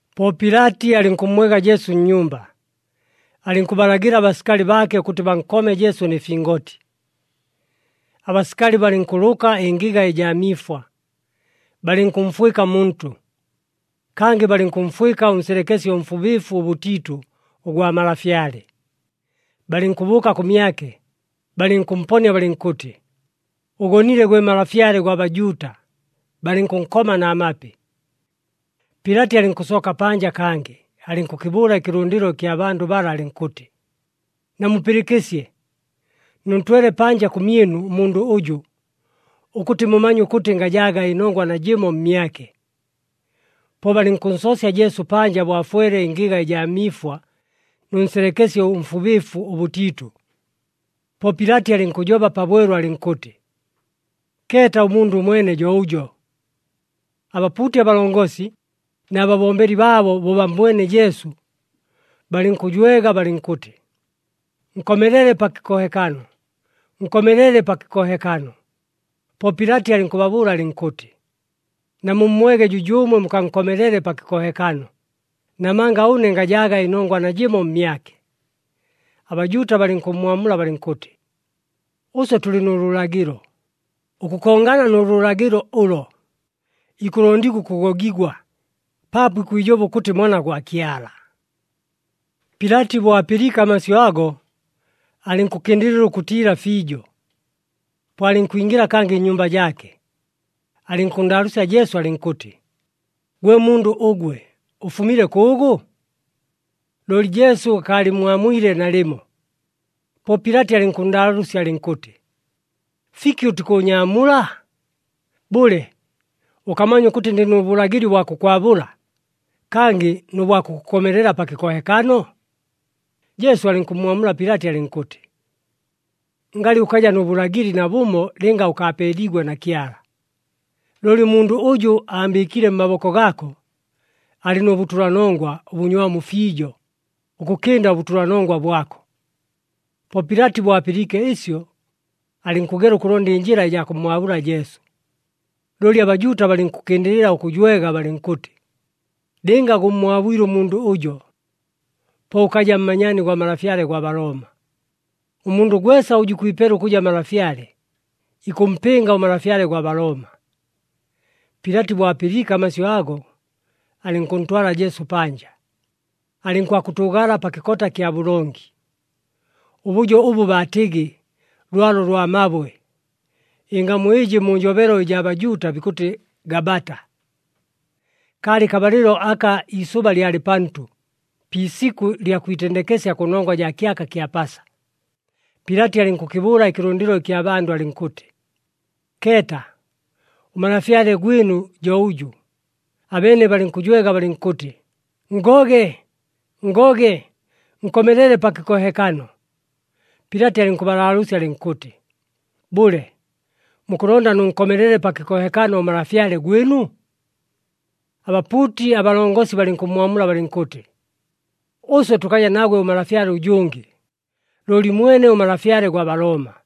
Po Pilati alɨnkʉmmwega Jesu nnyumba, alɨnkʉbalagɨla abasikali baake ʉkʉtɨ bankome Jesu nɨ fingoti. Abasikali balɨnkʉlʉka ɨngɨga ɨjaa miifwa, balɨnkʉmfwɨka muntʉ. Kangɨ balɨnkʉmfwɨka ʉnselekesye ʉmfubɨɨfu ʉbʉtiitʉ, ʉgwa malafyale. Balɨnkʉbʉʉka kʉmyake, balɨnkʉmponia balɨnkʉtɨ, “Ʉgonile, gwe Malafyale gwa Bajuuta!” Balɨnkʉnkoma na mapi. Pilati alɨnkʉsooka panja kangɨ, alɨnkʉkɨbʉʉla ɨkɨlʉndɨlo ɨkya bandʉ bala alɨnkʉtɨ, “Namupɨlɨkɨsye, nʉntwele panja kʉmyɨnu ʉmundʉ ʉjʉ, ʉkʉtɨ mumanye ʉkʉtɨ ngajaaga ɨnongwa najɨmo mmyake.” Po balɨnkʉnsoosya Jesu panja bo afwele ɨngɨga ɨjaa miifwa nʉ nselekesye ʉmfubɨɨfu ʉbʉtiitʉ. Po Pilati alɨnkʉjoba pabwelu alɨnkʉtɨ, “Keeta, ʉmundʉ ʉmwene jo ʉjo!” Abapuuti abalongosi na babombeli baabo bo bammbwene Jesu, balɨnkʉjwega balɨnkʉtɨ, “Nkomelele pa kɨkohekano, nkomelele pa kɨkohekano!” Po Pilati alɨnkʉbabʉʉla alɨnkʉtɨ, “Namummwege jʉjʉʉmwe mukankomelele pa kɨkohekano, namanga ʉne ngajaaga ɨnongwa najɨmo mmyake.” ABajuuta balɨnkʉmmwamula balɨnkʉtɨ, “Ʉswe tʉlɨ nʉ lʉlagɨlo. Ʉkʉkongana nʉ lʉlagɨlo ʉlo, ikʉlondigwa ʉkʉgogigwa, paapo ikwijoba ʉkʉtɨ Mwana gwa Kyala.” Pilati bo apɨliike amasyʉ ago, alɨnkʉkɨndɨlɨla ʉkʉtiila fiijo. Po alɨnkwingɨla kangɨ nnyumba jaake, alɨnkʉnndaalʉʉsya Jesu alɨnkʉtɨ, “Gwe mundʉ ʉgwe, ʉfumile kʉʉgʉ?” Looli Jesu akaalɨmmwamwile nalɨmo. Po Pilati alɨnkʉnndaalʉʉsya alɨnkʉtɨ, “Fiki ʉtikʉʉnyaamula? Bʉle, ʉkamanya ʉkʉtɨ ndɨ nʉ bʉlagɨli ʉbwa kʉkwabʉla, kangɨ nʉ bwa kʉkʉkomelela pa kɨkohekano?” Jesu alɨnkʉmmwamula Pilati alɨnkʉtɨ, “Ngalɨ ʉkaja nʉ bʉlagɨli nabʉmo lɨnga ʉkaapeeliigwe na Kyala. Looli ʉmundʉ ʉjʉ aambɨɨkile mmaboko gaako, alɨ nʉ bʉtʉlanongwa ʉbʉnywamu fiijo ʉkʉkɨnda ʉbʉtʉlanongwa bwako.” Po Pilati bo apɨliike ɨsyo, alɨnkʉgela ʉkʉlonda ɨnjɨla ɨjaa kʉmmwabʉla Jesu, looli aBajuuta balɨnkʉkɨndɨlɨla ʉkʉjwega balɨnkʉtɨ, “Lɨnga gʉmmwabwile ʉmundʉ ʉjo, po ʉkaja mmanyaani gwa malafyale gwa Balooma. Ʉmundʉ gwesa ʉjʉ ikwipela ʉkʉja malafyale, ikʉmpɨnga ʉmalafyale gwa Balooma.” Pilati bo apɨliike amasyʉ ago, alɨnkʉntwala Jesu panja, alɨnkwakʉtʉʉgala pa kɨkota kya bʉlongi, ʉbʉjo ʉbʉ baatɨgɨ, Lwalo lwa Mabwe (ɨngamu ɨjɨ mu njobelo ɨjaa Bajuuta, bikʉtɨ Gabata). Kaalɨ kabalɨlo aka iisʉba lyalɨ pantʉ, pi isikʉ lya kwitendekesya kʉnongwa jaa kyaka kya Pasa. Pilati alɨnkʉkɨbʉʉla ɨkɨlʉndɨlo ɨkya bandʉ alɨnkʉtɨ, “Keeta, ʉmalafyale gwɨnu jo ʉjʉ!” Abeene balɨnkʉjwega balɨnkʉtɨ, “Nngoge, nngoge! Nkomelele pa kɨkohekano!” Pilati alɨnkʉbalaalʉʉsya alɨnkʉtɨ, “Bʉle, mukʉlonda nʉnkomelele pa kɨkohekano ʉmalafyale gwɨnu?” Abapuuti abalongosi balɨnkʉmmwamula balɨnkʉtɨ, “Ʉswe tʉkaja nagwe ʉmalafyale ʉjʉngɨ, looli mwene ʉmalafyale gwa Balooma!”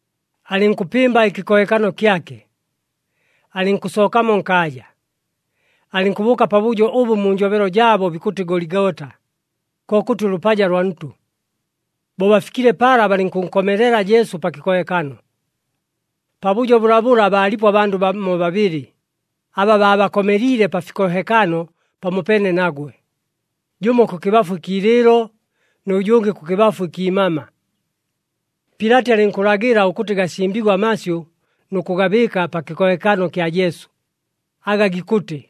Alɨnkʉpɨmba ɨkɨkohekano kyake, alɨnkʉsookamo nkaaja, alɨnkʉbʉʉka pabʉjo ʉbʉ mu njobelo jaabo bikʉtɨ Goligota, kokʉtɨ ʉLʉpaja lwa Ntʉ. Bo bafikile pala, balɨnkʉnkomelela Jesu pa kɨkohekano. Pabʉjo bʉlabʉla baalipo abandʉ bamo babɨlɨ aba baabakomeliile pa fikohekano pamopeene nagwe, jʉmo kʉkɨbafu ɨkiilɨɨlo, nʉ jʉngɨ kʉkɨbafu ɨkiimama. Pilati alɨnkʉlagɨla ʉkʉtɨ gasimbigwe amasyʉ nʉ kʉgabɨɨka pa kɨkohekano kya Jesu, aga gikʉtɨ,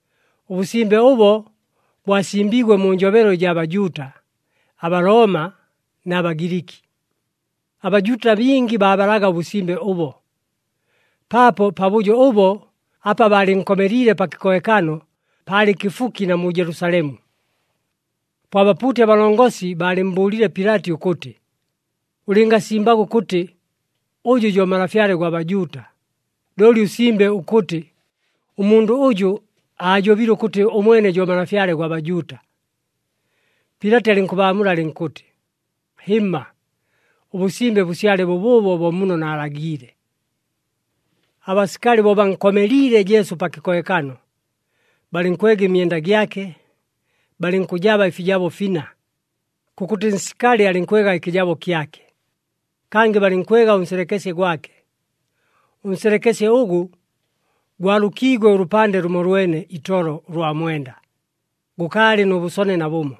Ʉbʉsimbe ʉbo bwasimbiigwe mu njobelo ɨjaa Bajuuta, aBalooma na Bagiliki. ABajuuta bingi baabalaga ʉbʉsimbe ʉbo, paapo pabʉjo ʉbo apa baalɨnkomeliile pa kɨkohekano, paalɨ kɨfuki na mu Jelusalemu. Po abapuuti abalongosi baalɨmmbʉʉlile Pilati ʉkʉtɨ, “Ʉlɨngasimbaga ʉkʉtɨ, ‘Ʉjʉ jo Malafyale gwa Bajuuta,’ looli ʉsimbe ʉkʉtɨ, ‘Ʉmundʉ ʉjʉ aajobile ʉkʉtɨ ʉmwene jo Malafyale gwa Bajuuta.’” Pilati alɨnkʉbaamula alɨnkʉtɨ, “Hɨmma, ʉbʉsimbe bʉsyale bʉbʉʉbo bo muno naalagiile.” Abasikali bo bankomeliile Jesu pa kɨkohekano, balɨnkwega ɨmyenda gyake, balɨnkʉjaba ɨfijabo fina. Kʉkʉtɨ nsikali alɨnkwega ɨkɨjabo kyake. Kangɨ balɨnkwega ʉnselekesye gwake. Ʉnselekesye ʉgʉ, gwalʉkiigwe ʉlʉpande lʉmolwene itolo ʉlwa mwenda, gʉkaalɨ nʉ bʉsone nabʉmo.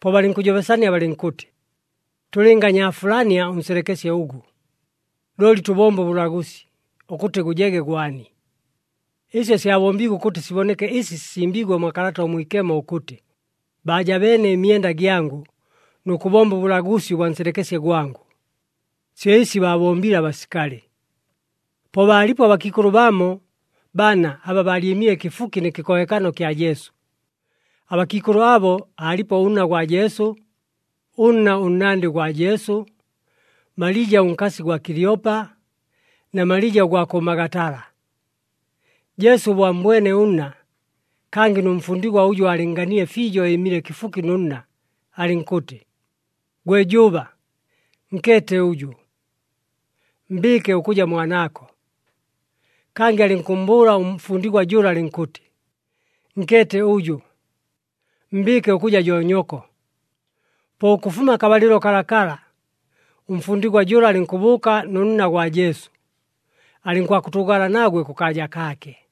Po balɨnkʉjobesania balɨnkʉtɨ, “Tʉlɨnganyaafulania ʉnselekesye ʉgʉ, looli tʉbombe ʉbʉlagʉsi ʉkʉtɨ gʉjege gwani.” Ɨsyo syabombiigwe ʉkʉtɨ siboneke ɨsi sisimbiigwe mwa Kalata ʉMwikemo ʉkʉtɨ, “Baajabeene ɨmyenda gyangʉ, nʉ kʉbomba ʉbʉlagʉsi ʉbwa nselekesye gwangʉ.” Syo ɨsi baabombile abasikali. Po baalipo abakiikʉlʉ bamo bana aba baalyɨmile kɨfuki nɨ kɨkohekano kya Jesu. Abakiikʉlʉ abo aalipo ʉnna gwa Jesu, ʉnna ʉnnandɨ gwa Jesu, Malija ʉnkasi gwa Kilyopa, na Malija ʉgwa kʉ Magatala. Jesu bo ammbwene ʉnna, kangɨ nʉ mfundigwa ʉjʉ aalɨnnganile fiijo ɨɨmile kɨfuki nʉ nna, alɨnkʉtɨ, “Gwe jʉʉba, nkeete ʉjʉ. Mbɨɨke ʉkʉja mwanaako.” Kangɨ alɨnkʉmmbʉʉla ʉmfundigwa jʉla alɨnkʉtɨ, “Nkeete ʉjʉ. Mbɨɨke ʉkʉja jo nyoko.” Po ʉkʉfuma akabalɨlo kalakala ʉmfundigwa jʉla alɨnkʉbʉʉka nʉ nna gwa Jesu, alɨnkwakʉtʉʉgala nagwe kʉkaaja kaake.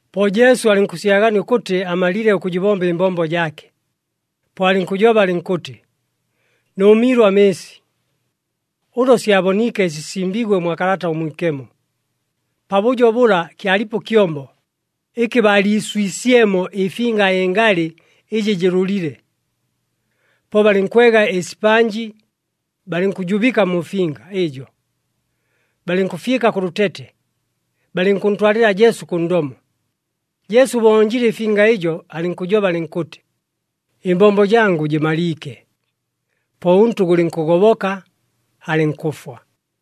Po Jesu alɨnkʉsyagania ʉkʉtɨ amalile ʉkʉjɨbomba ɨmbombo jaake. Po alɨnkʉjoba alɨnkʉtɨ, “Nʉʉmiilwe amɨɨsi.” Ʉlo syaboniike ɨsi sisimbiigwe mwa Kalata ʉMwikemo. Pabʉjo bʉla kyalipo ɨkyombo ɨkɨ baaliiswisyemo ɨfinga ɨngalɨ ɨjɨ jɨlʉlile. Po balɨnkwega ɨsipanji, balɨnkʉjubɨka mu finga ɨjo, balɨnkʉfyɨka kʉ lʉtete, balɨnkʉntwalɨla Jesu kʉ ndomo. Jesu bo onjile ɨfinga ɨjo, alɨnkʉjoba alɨnkʉtɨ, “Ɨmbombo jangʉ jɨmaliike!” Po ʉntʉ gʉlɨnkʉgoboka, alɨnkʉfwa.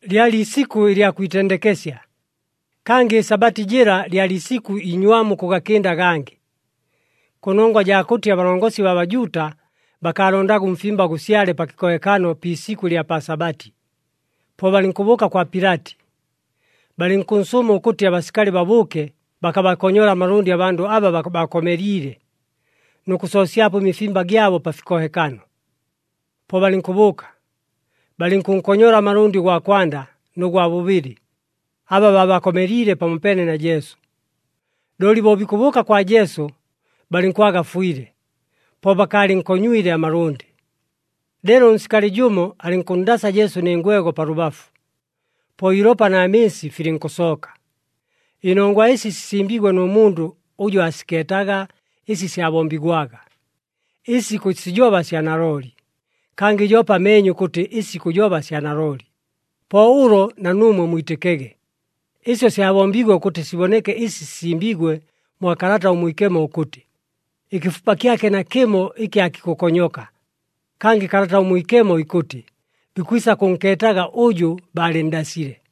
Lyalɨ isikʉ ɨlya kwitendekesya, kangɨ ɨSabati jɨla lyalɨ isikʉ inywamu ʉkʉgakɨnda agangɨ. Kʉnongwa jaa kʉtɨ abalongosi baa Bajuuta bakaalondaga ʉmfimba gʉsyale pa kɨkohekano pi isikʉ ɨlya pa Sabati, po balɨnkʉbʉʉka kwa Pilati, balɨnkʉnsʉʉma ʉkʉtɨ abasikali babʉʉke bakabakonyole amalʉndɨ abandʉ aba baabakomeliile, nʉ kʉsoosyapo ɨmifimba gyabo pa fikohekano. Po balɨnkʉbʉʉka, balɨnkʉnkonyola amalʉndɨ ʉgwa kwanda nʉ gwa bʉbɨlɨ aba baabakomeliile pamopeene na Jesu. Looli bo bikʉbʉʉka kwa Jesu, balɨnkwaga afwile, po bakaalɨnkonywile amalʉndɨ. Leelo ʉnsikali jʉmo alɨnkʉnndasa Jesu nɨ ngwego pa lʉbafu. Po iilopa na mɨɨsi filɨnkʉsooka. Ɨnongwa ɨsi sisimbiigwe nʉ mundʉ ʉjʉ aasikeetaga ɨsi syabombigwaga. Ɨsi ikʉsijoba sya nalooli, kangɨ joope ameenye ʉkʉtɨ ɨsi ikʉjoba sya nalooli. Po ʉlo na nuumwe mwitɨkege. Ɨsyo syabombiigwe ʉkʉtɨ siboneke ɨsi sisimbiigwe mwa Kalata ʉMwikemo ʉkʉtɨ, “Ɨkɨfupa kyake nakɨmo ɨkɨ aakikʉkonyoka.” Kangɨ Kalata ʉMwikemo ikʉtɨ, “Bikwisa kʉnkeetaga ʉjʉ baalɨnndasile.”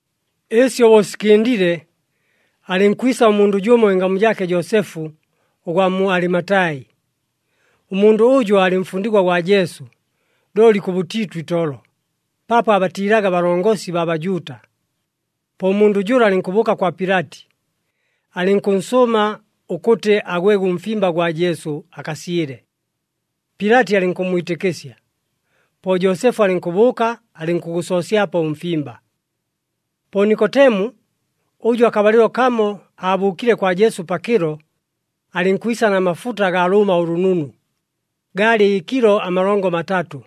Ɨsyo bo sikɨndile, alɨnkwisa ʉmundʉ jʉmo ɨngamu jaake Joosefu ʉgwa mu Alimatai. Ʉmundʉ ʉjʉ aalɨ mfundigwa gwa Jesu, looli kʉbʉtiitʉ itolo, paapo aabatiilaga abalongosi baa Bajuuta. Po ʉmundʉ jʉla alɨnkʉbʉʉka kwa Pilati, alɨnkʉnsʉʉma ʉkʉtɨ agwege ʉmfimba gwa Jesu akasyɨle. Pilati alɨnkʉmmwitɨkɨsya. Po Joosefu alɨnkʉbʉʉka, alɨnkʉgʉsoosyapo ʉmfimba. Po Nikotemu, ʉjʉ akabalɨlo kamo aabʉʉkile kwa Jesu pakɨlo, alɨnkwisa na mafuta agaa lʉʉma ʉlʉnunu, gaalɨ kilo amalongo matatʉ.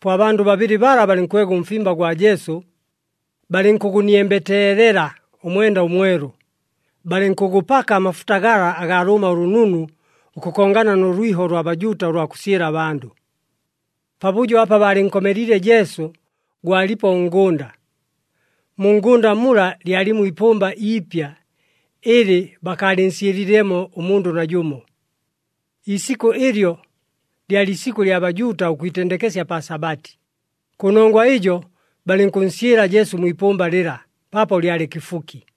Po abandʉ babɨlɨ bala balɨnkwega ʉmfimba gwa Jesu, balɨnkʉgʉniembeteelela ʉmwenda ʉmwelu, balɨnkʉgʉpaka amafuta gala agaa lʉʉma ʉlʉnunu ʉkʉkongana nʉ lwiho ʉlwa Bajuuta ʉlwa kʉsyɨla abandʉ. Pabʉjo apa baalɨnkomeliile Jesu gwalipo ʉngʉnda. Mu ngʉnda mula lyalimo iipʉmba iipya ɨlɨ bakaalɨnsyɨlilemo ʉmundʉ najʉmo. Iisikʉ ɨlyo, lyalɨ isikʉ ɨlya Bajuuta ʉkwitendekesya pa Sabati. Kʉnongwa ɨjo balɨnkʉnsyɨla Jesu mwi ipʉmba lɨla, paapo lyalɨ kɨfuki.